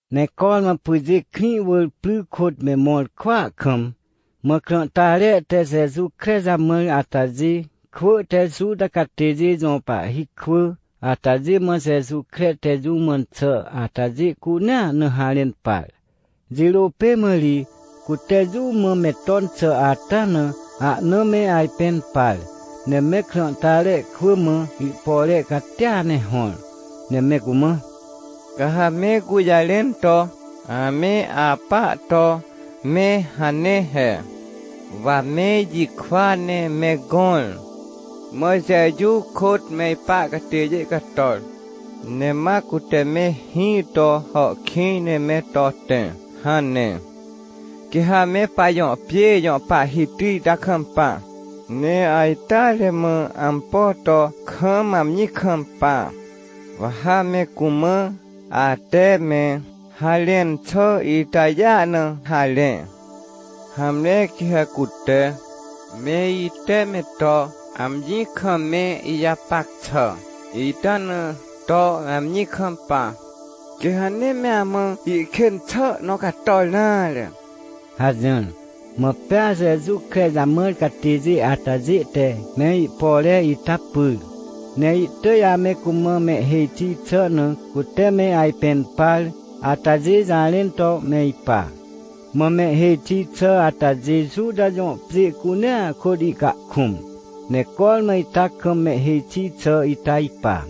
Ne cormã pyjê krĩ wỳr pry kôt me mõr kwỳa kam, mã krãhtare te Jeju kre jamãr atajê kwỳ te Juta catêjê jõ pahhi kwỳ atajê mã Jeju kre te jũ mãn xà atajê cunea na harẽn par. Jirô pê mã ri cute jũ mã me ton xà ata na ahna me ajpẽn par, ne me krãhtare kwỳ mã ihpore catia ne hõr, ne me cumã: — Ca ha me gũjarẽn to ame apa to me hane he: “Wa me ijikwa ne me gõr, mã Jeju kôt me ipa catêjê cator, ne ma cute me hĩ to hàhkĩj ne me to tẽ” hane. — Quê ha me pajõ pjê jõ pahhiti ita kampa, ne ajteare mã ampo to kam amji kampa, wa ha me cumã ate me harẽn xà itajêa na harẽ. Hamre quê ha cute, me ite me to amji kam me ijapac xà ita na to amji kampa, quê ha nee me amã ihkên xà nõ cator nare — hajỹr. Mã pea Jeju kre jamãr catêjê atajê te me ihpore ita pyr, ne ihtỳj ame cumã mehhêj xi xà na cute me ajpẽn par atajê jarẽn to me ipa. Mã mehhêj xi xà atajê Juta jõ pjê cunea kôt ihcahkũm. Ne cormã ita kam mehhêj xi xà ita ipa.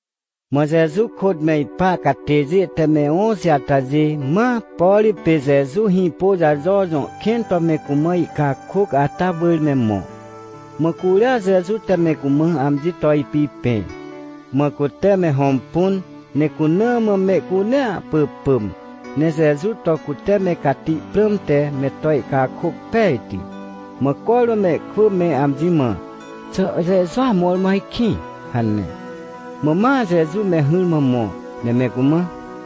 Mã Jeju kôt me ipa catêjê te me õxi atajê, ma, por pê Jeju Hĩpôjajo jõ kẽn to me cumã ihcakôc ata wỳr me mõ. Mã curia Jeju te me cumã amji to ipipẽ. Mã cute me hõmpun ne cuna mã mehcunea pỳpỳm, ne Jeju to cute me cati prãmte me to ihcakôc pejti. Mã cormã mehkwỳ me amji mã: “Xà Jejua mõrmõ ajkĩ?” hane. Mã ma Jeju me hỹrmã mõ, ne me cumã: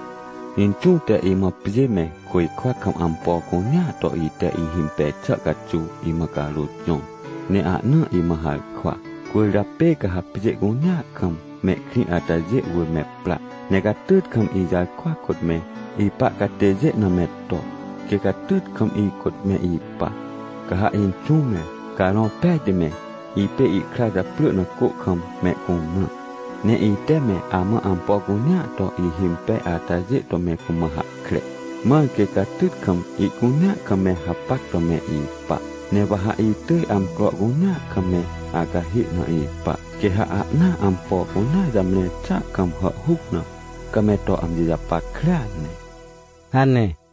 — Inxũ te imã pjê me côjkwa kam ampo cunea to ite ihimpej xà caxuw imã carôt jõr, ne ahna imã harkwa. Cwỳrjapê ca ha pjê cunea kam mehkrĩ atajê wỳr me pra, ne catyt kam ijarkwa kôt me ipa catêjê na me to, quê catyt kam ikôt me ipa. Ca ha Inxũ me, Carõ Pejti me, ipê ihkra japrỳ na cô kam mehcumrã. Ne ite me amã ampo cunea to ihimpej atajê to me cumã hahkre, mãr quê catyt kam ihcunea kam me hapac to me ipa. Ne wa ha itỳj amcro cunea kam me acahê na ipa, quê ha ahnaa ampo cunea jamre xà kam hàhhuc na, ca me to amji japackrea ne — hane.